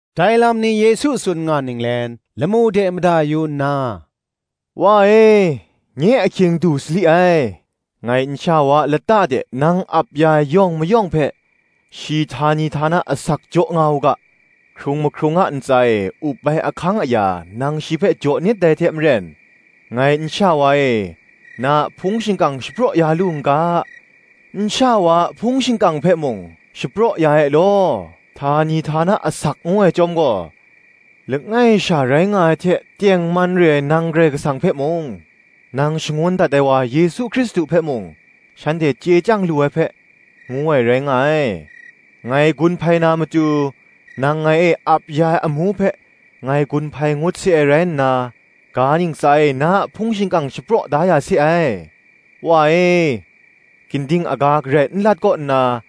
Dai lam ni Yesu tsun nga ninglen, lamu de mada yu nna, “Wa e, nye ahkying du sali ai: ngai nsha wa a lata de nang ap ya ai yawng mayawng hpe shi htani htana asak jaw nga u ga, hkrung mahkrung a ntsa e up ai ahkang aya nang shi hpe jaw nit dai hte maren, ngai nsha wa e na a hpung shingkang shapraw ya lu n ga, nsha wa a hpung shingkang hpe mung, shapraw ya e law. Htani htana asak ngu ai chyawm gaw, langai sha rai nga ai hte tengman re ai nang Karai Kasang hpe mung, nang shangun dat ai wa Yesu Hkristu hpe mung, shanhte chye chyang lu ai hpe, ngu ai, rai nga ai. Ngai gun hpai na matu, nang ngai e ap ya ai amu hpe, ngai gun hpai ngut se ai rai nna, ga ntsa e na a hpung shingkang shapraw da ya se ai. Wa e, ginding aga garai n lat kaw nna,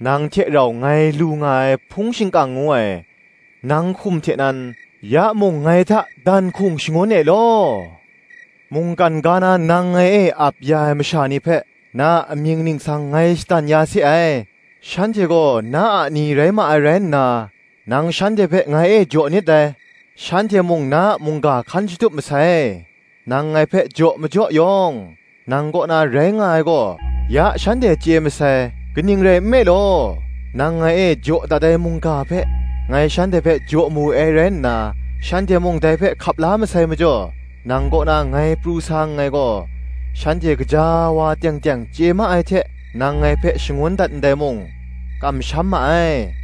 nang hte rau ngai lu nga ai hpung shingkang ngu ai, nang hkum hte nan, ya mung ngai hta dan hkung shangun e law. Mungkan ga na nang ngai e ap ya ai masha ni hpe, na a amying ningsang ngai shadan ya se ai; shanhte gaw na a ni rai ma ai rai nna, nang shanhte hpe ngai e jaw nit dai; shanhte mung na a mungga hkan shatup masai. Nang ngai hpe jaw majaw yawng, nang kaw na rai nga ai gaw, ya shanhte chye masai: kaning rai nme law nang ngai e jaw dat ai mungga hpe, ngai shanhte hpe jaw mawe ai rai nna, shanhte mung dai hpe hkap la masai majaw, nang kaw na ngai pru sa nngai gaw, shanhte gaja wa teng teng chye ma ai hte, nang ngai hpe shangun dat ndai mung, kamsham ma ai.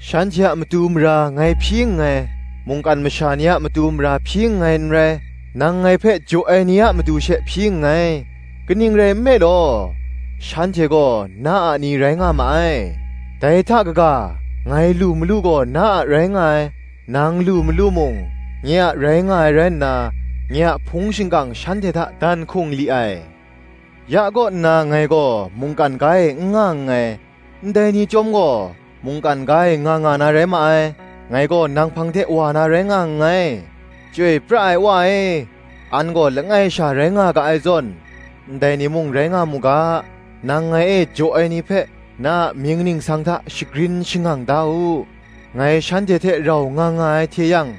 Shanhte a matu mara ngai hpyi nngai: mungkan masha ni a matu mara hpyi nngai n rai; nang ngai hpe jaw ai ni a matu she hpyi nngai; kaning rai nme law, shanhte gaw, na a ni rai nga ma ai: dai hta kaga, ngai lu malu gaw na a rai nga ai; nang lu malu mung, nye a rai nga ai rai nna, nye a hpung shingkang shanhte hta dan hkung li ai. Ya kaw nna ngai gaw mungkan ga e n nga nngai, ndai ni chyawm gaw, mungkan ga e nga nga na rai ma ai: ngai gaw nang hpang de wa na rai nga nngai. Chyoi pra ai Wa e, an gaw langai sha rai nga ga ai zawn, ndai ni mung rai nga mu ga, nang ngai e jaw ai ni hpe, na a mying ningsang hta shagrin shangang da u. Ngai shanhte hte rau nga nga ai hte yang,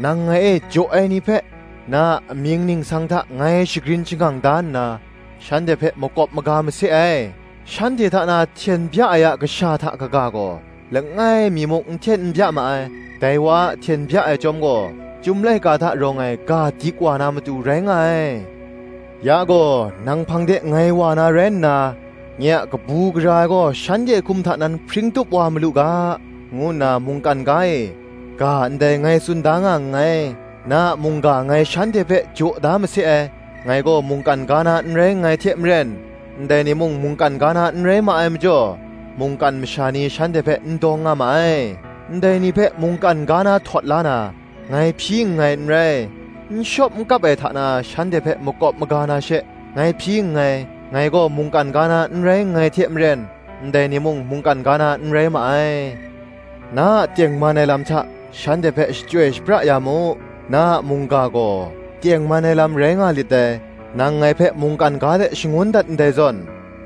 nang ngai e jaw ai ni hpe, na a amying ningsang hta ngai shagrin shangang da nna, shanhte hpe makawp maga mase ai: shanhte hta na hten bya ai a kasha hta kaga gaw, langai mi muk n hten n bya ma ai; dai wa a hten bya ai chyawm gaw, Chyum laika hta rawng ai ga dik wa na matu rai nga ai. “Ya gaw nang hpang de ngai wa na rai nna, nye a kabu gara ai gaw shanhte hkum hta nan hpring tup wa malu ga, ngu nna mungkan ga e, ga ndai ngai tsun da nga nngai. Na a mungga ngai shanhte hpe jaw da mase ai: ngai gaw mungkan ga na n rai nngai hte maren, ndai ni mung mungkan ga na n rai ma ai majaw, mungkan masha ni shanhte hpe n dawng nga ma ai. Ndai ni hpe mungkan ga na htawt la na, ngai hpyi nngai n rai, n shawp n kap ai hta na shanhte hpe makawp maga na she, ngai hpyi nngai. Ngai gaw mungkan ga na n rai nngai hte maren, ndai ni mung mungkan ga na n rai ma ai. Na a tengman ai lam hta, shanhte hpe shachyoi shapra ya mu; na a mungga gaw, tengman ai lam rai nga lit dai. Nang ngai hpe mungkan ga de shangun dat ndai zawn,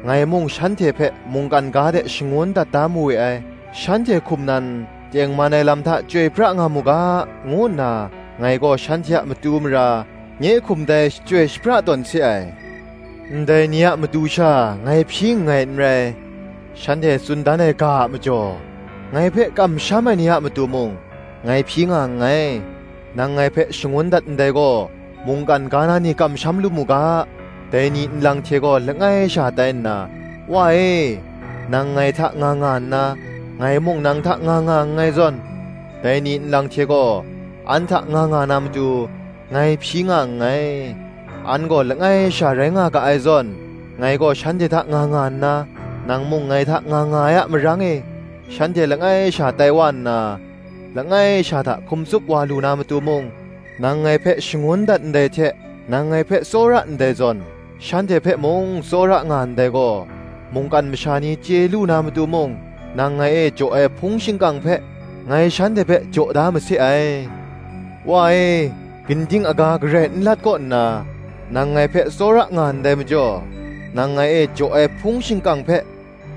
ngai mung shanhte hpe mungkan ga de shangun dat da mawe ai. Shanhte hkum nan, tengman ai lam hta chyoi pra nga mu ga, ngu nna ngai gaw shanhte a matu mara, nye hkum dai shachyoi shapra tawn se ai. “Ndai ni a matu sha ngai hpyi nngai n rai; shanhte tsun dan ai ga a majaw, ngai hpe kamsham ai ni a matu mung, ngai hpyi nga nngai: nang ngai hpe shangun dat ndai gaw, mungkan ga na ni kamsham lu mu ga, dai ni nlang hte gaw langai sha tai nna, Wa e, nang ngai hta nga nga nna, ngai mung nang hta nga nga nngai zawn, dai ni nlang hte gaw, an hta nga nga na matu, ngai hpyi nga nngai. An gaw langai sha rai nga ga ai zawn, ngai gaw shanhte hta nga nga nna, nang mung ngai hta nga nga ai a marang e, shanhte langai sha tai wa nna, langai sha hta hkum tsup wa lu na matu mung, nang ngai hpe shangun dat ndai hte nang ngai hpe tsawra ndai zawn, shanhte hpe mung tsawra nga ndai gaw, mungkan masha ni chye lu na matu mung, nang ngai e jaw ai hpung shingkang hpe, ngai shanhte hpe jaw da mase ai. “Wa e, gingding aga garai n lat kaw nna, nang ngai hpe tsawra nga ndai majaw, nang ngai e jaw ai hpung shingkang hpe,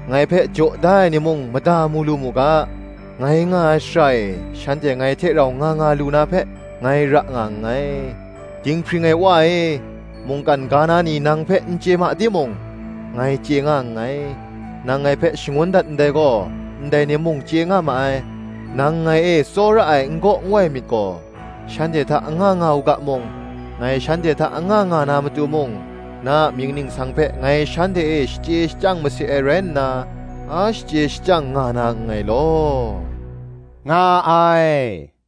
ngai hpe jaw da ai ni mung mada mu lu mu ga, ngai nga ai shara e shanhte ngai hte rau nga nga lu na hpe, ngai ra nga nngai. Dinghpring ai Wa e, mungkan ga na ni nang hpe n chye ma timung, ngai chye nga nngai: nang ngai hpe shangun dat ndai gaw, ndai ni mung chye nga ma ai: nang ngai e tsawra ai n-gaw nwai myit gaw, shanhte hta anga nga u ga mung, ngai shanhte hta anga nga na matu mung, na a mying ningsang hpe ngai shanhte e shachye shachyang mase ai rai nna, a shachye shachyang nga na nngai law,” nga ai.